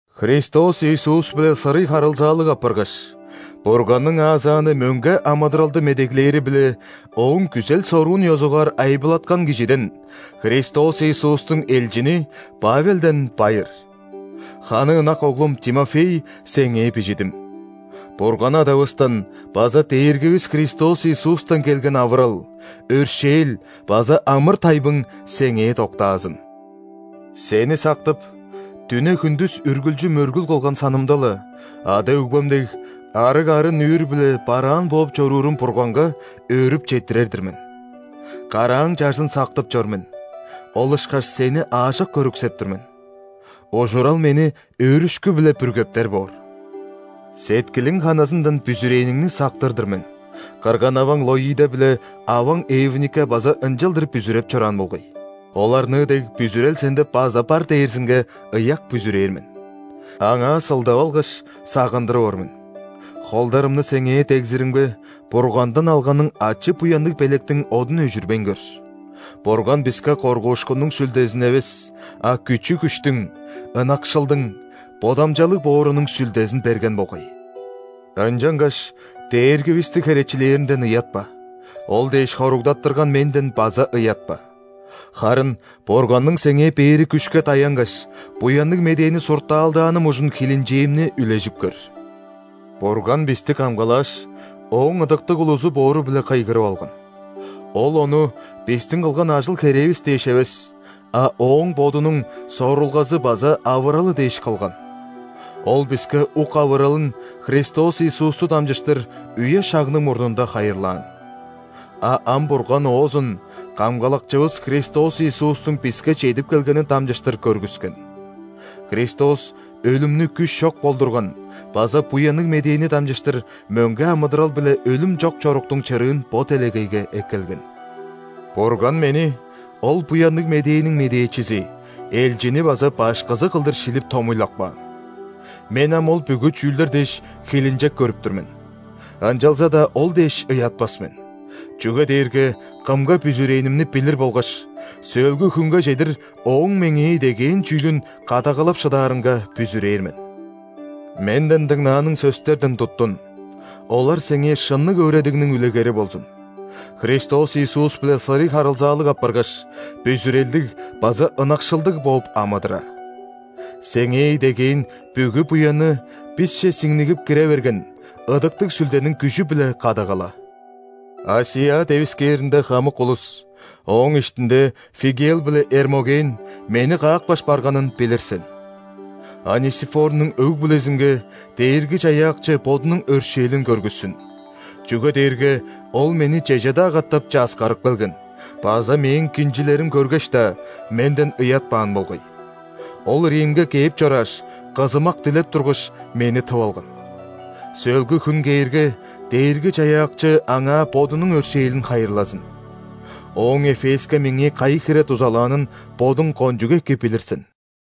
Христос Иисус-биле сырый харылзаалыг апаргаш, Бурганның аазааны мөңге амыдыралды медеглээри-биле Ооң күзел-соруун ёзугаар айбылаткан кижиден, Христос Иисустуң элчини Павелден байыр. Ханы ынак оглум Тимофей сеңээ бижидим. Бурган Адавыстан база Дээргивис Христос Иисустан келген авырал, өршээл база амыр-тайбың сеңээ доктаазын! Сени сактып, дүне, хүндүс үргүлчү мөргүл кылган санымда-ла, ада-өгбем дег, арыг арын-нүүр-биле бараан бооп чоруурум Бурганга өөрүп четтирер-дир мен. Карааң чажын сактып чор мен, ол ышкаш сени аажок көрүксеп тур мен: ужурал мени өөрүшкү-биле бүргептер боор! Сеткилиң ханызындан бүзүрээниңни сактыр-дыр мен: кырган-аваң Лоида биле аваң Эвника база ынчалдыр бүзүреп чораан болгай. Оларныы дег бүзүрел сенде база бар дээрзинге ыяк бүзүрээр мен. Аңаа сылдап алгаш, сагындырып ор мен: холдарымны сеңээ дегзиримге, Бургандан алганың ачы-буянныг белектиң одун өжүрбейн көр. Бурган биске коргуушкуннуң сүлдезин эвес, а күчү-күштүң, ынакшылдың, бодамчалыг боорунуң Сүлдезин берген болгай. Ынчангаш Дээргивисти херечилээринден ыятпа, Ол дээш хоругдаттырган менден база ыятпа. Харын Бурганның сеңээ бээри күшке даянгаш, Буянныг Медээни суртаалдааным ужун хилинчээмни үлежип көр. Бурган бисти камгалааш, Ооң ыдыктыг улузу боору-биле кыйгырып алган. Ол ону бистиң кылган ажыл-херээвис дээш эвес, а Ооң Бодунуң сорулгазы база авыралы дээш кылган. Ол биске ук авыралын Христос Иисусту дамчыштыр үе-шагның мурнунда хайырлаан. А ам Бурган оозун Камгалакчывыс Христос Иисустуң биске чедип келгенин дамчыштыр көргүскен. Христос өлүмнү күш чок болдурган база Буянныг Медээни дамчыштыр мөңге амыдырал биле өлүм чок чоруктуң чырыын бо делегейге эккелген. Бурган мени ол Буянныг Медээниң медээчизи, элчини база башкызы кылдыр шилип томуйлап каан! Мен ам ол бүгү чүүлдер дээш, хилинчек көрүп тур мен. Ынчалза-даа ол дээш ыятпас мен, чүге дээрге Кымга бүзүрээнимни билир болгаш, сөөлгү хүнге чедир Ооң меңээ идегээн чүүлүн кадагалап шыдаарынга бүзүрээр мен. Менден дыңнааның сөстерден туттун, олар сеңээ шынныг өөредигниң үлегери болзун, Христос Иисус-биле сырый харылзаалыг апаргаш, бүзүрелдиг база ынакшылдыг бооп амыдыра. Сеңээ идегээн бүгү буянны бисче сиңнигип кире берген Ыдыктыг Сүлдениң күжү-биле кадагала. ·Асия девискээринде хамык улус, ооң иштинде Фигелл биле Эрмоген, мени каапкаш барганын билир сен. Онисифорнуң өг-бүлезинге Дээрги-Чаяакчы Бодунуң өршээлин көргүссүн, чүге дээрге ол мени чеже-даа катап часкарып келген база мээң кинчилерим көргеш-даа, менден ыятпаан болгай. Ол Римге кээп чорааш, кызымак дилеп тургаш, мени тып алган. Сөөлгү хүн кээрге, Дээрги-Чаяакчы аңаа Бодунуң өршээлин хайырлазын. Ооң Эфеске меңээ кайы хире дузалаанын бодуң кончуг эки билир сен.